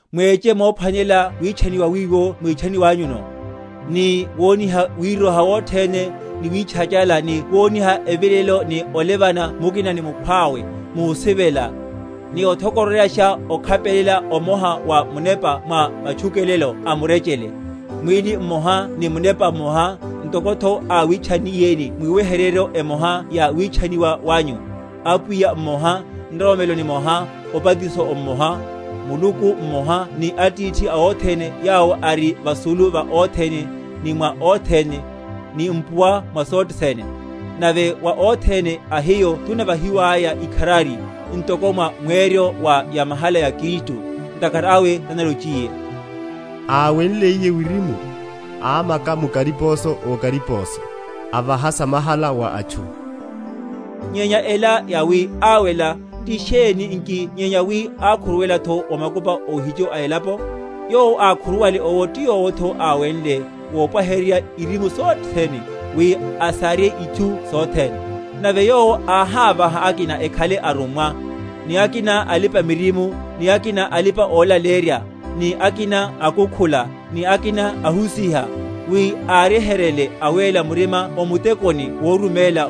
mweche mophwanelela witchaniwa wiwo mwítchaniwanyuno, ni woniha wiroha wothene, ni witchachala, ni woniha evilelelo, ni olevelana mukina ni mukhwawe, musivela; ni othokororyasha okhapelela omoha wa Munepa mwa matchukelelo a murechele. Mwíli mmoha ni Munepa mmoha, ntokotho áwitchanniyeni mwiweheryeryo emoha ya witchaniwa wanyu; Apwiya mmoha, nroromelo nimoha, obatiso omoha, Muluku mmoha ni Atithi a othene yawo ari vasulu va othene, ni mwa othene, ni mpuwa mwa sothe sene. Nave wa othene a hiyo tunavahiwaya ikharari, ntoko mwa mweryo wa yamahala ya Kristu. Ntakhara awe tanalochiye, Áwenliye wirimu, ámaka mu kariposo okariposo, Avaha samahala wa atchu. Nyenya ela, yawi, Áwela, ti sheni nki nyenya wi ákhuruwelatho o makupa óhicho a elapo? Yowo ákhuruwale owo ti yowotho áwenle, vopwaheryaru irimu sothene, wi asarye itchu sothene. Nave Yowo áhávaha akina ekhale arummwa; ni akina alipa‐miririmo; ni akina alipa‐olaleyerya; ni akina akukhula, ni akina ahusiha; wi áryeheryele awéla murima o mutekoni woruméla,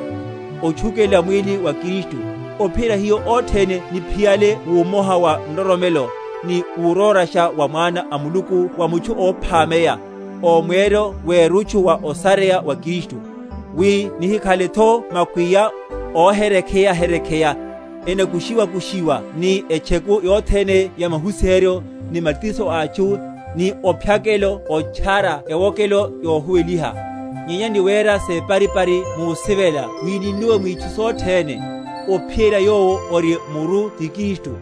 otchukelela mwíli wa Kristu; ophiyerya hiyo othene niphiyale wúmoha wa nroromelo, ni wurórasha wa Mwana a Muluku, wa mutchu óphameya, o mweryo werutchu wa osareya wa Kristu. Wi nihikhaletho makwiya, óhekereya?-?hekereya, enakushiwa‐kushiwa ni etcheku yothene ya mahusiheryo, ni matiso a atchu, ni ophyakela otchara ewokelo yohuweliha; nyenya ni wera separipari musivela wi ninnuwe mwitchu sothene, ophiyerya Yowo ori muru ti Kristu;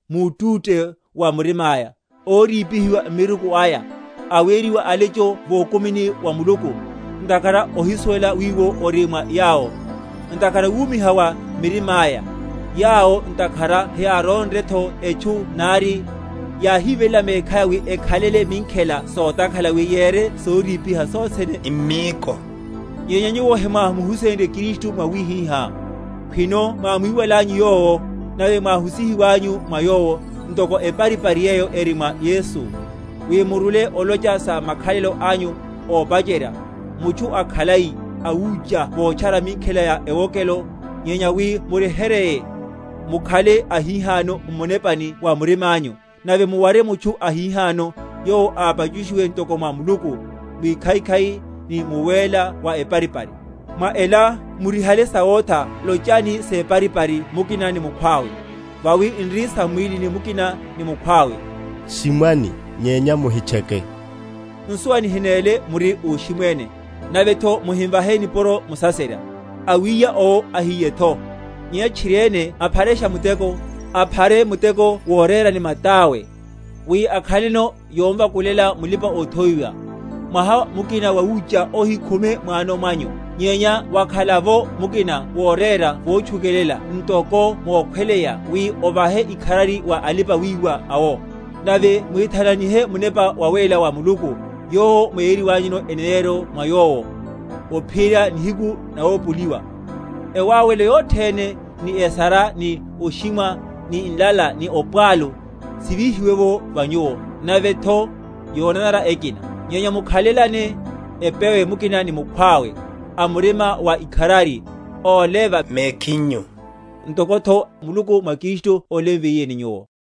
mútúte wa murimáya, órípihiwa m’miruku aya, aweriwa alecho vokumini wa Muluku, ntakhara ohisuwela wiwo ori mwa yawo, ntakhara wumiha wa mirimáya; yawo ntakhara heyárónretho etchu nari, yáhiveléla mekhaya wi ekhalele minkhela sotakhala, wi yere sorípiha sothene m’míko. Nyenya nyuwo hemwámuhusenrye Kristu mwawihihá, khwino mwámwiwalanyu Yowo, nave mwáhusihiwanyu mwa Yowo, ntoko eparipari yeyo eri mwa Yesu; wi murule, olocha sa makhalelo anyu ópacherya, mutchu akhalai, awucha votchara minkhela ya ewokelo; nyenya wi muryeheryeye, mukhale ahihano m’munepani wa murimányu, nave muware mutchu ahihano, yowo ápachushiwe ntoko mwa Muluku, mwikhaikhai, ni muwéla wa eparipari. Mwa ela, murihale sawotha, lochani separipari mukina ni mukhwawe; vawi n’ri sam’mwílini mukina ni mukhwawe. Shimwani, nyenya muhitcheke; nsuwa nihinéle muri óshimwéne, navetho muhimvahe nipuro musaserya. Awíya owo ahíyetho; nyenya tchiriene apharashe muteko, aphare muteko worera ni matáwe, wi akhaleno yomvakulela mulipa‐othowiwa. Mwaha mukina wawucha ohikhume mwano mwanyu, nyenya wakhala’vo mukina worera votchukelela ntoko mokhweleya, wi ovahe ikharari wa alipa‐wiwa awo. Nave muhithananihe Munepa Wawéla wa Muluku, yowo mwéyeryiwanyuno eneneryo mwa Yowo, ophiyerya nihiku nawopoliwa. Ewáwelo yothene, ni esara, ni oshimwa, ni nlala, ni opwalu sivíhiwe’vo va nyuwo, navetho yonanara ekina. Nyenya mukhalelane epewe mukina ni mukhwawe, a murima wa ikharari, ólevana mekhinyu, ntokotho Muluku mwa Kristu ólemviyeni nyuwo.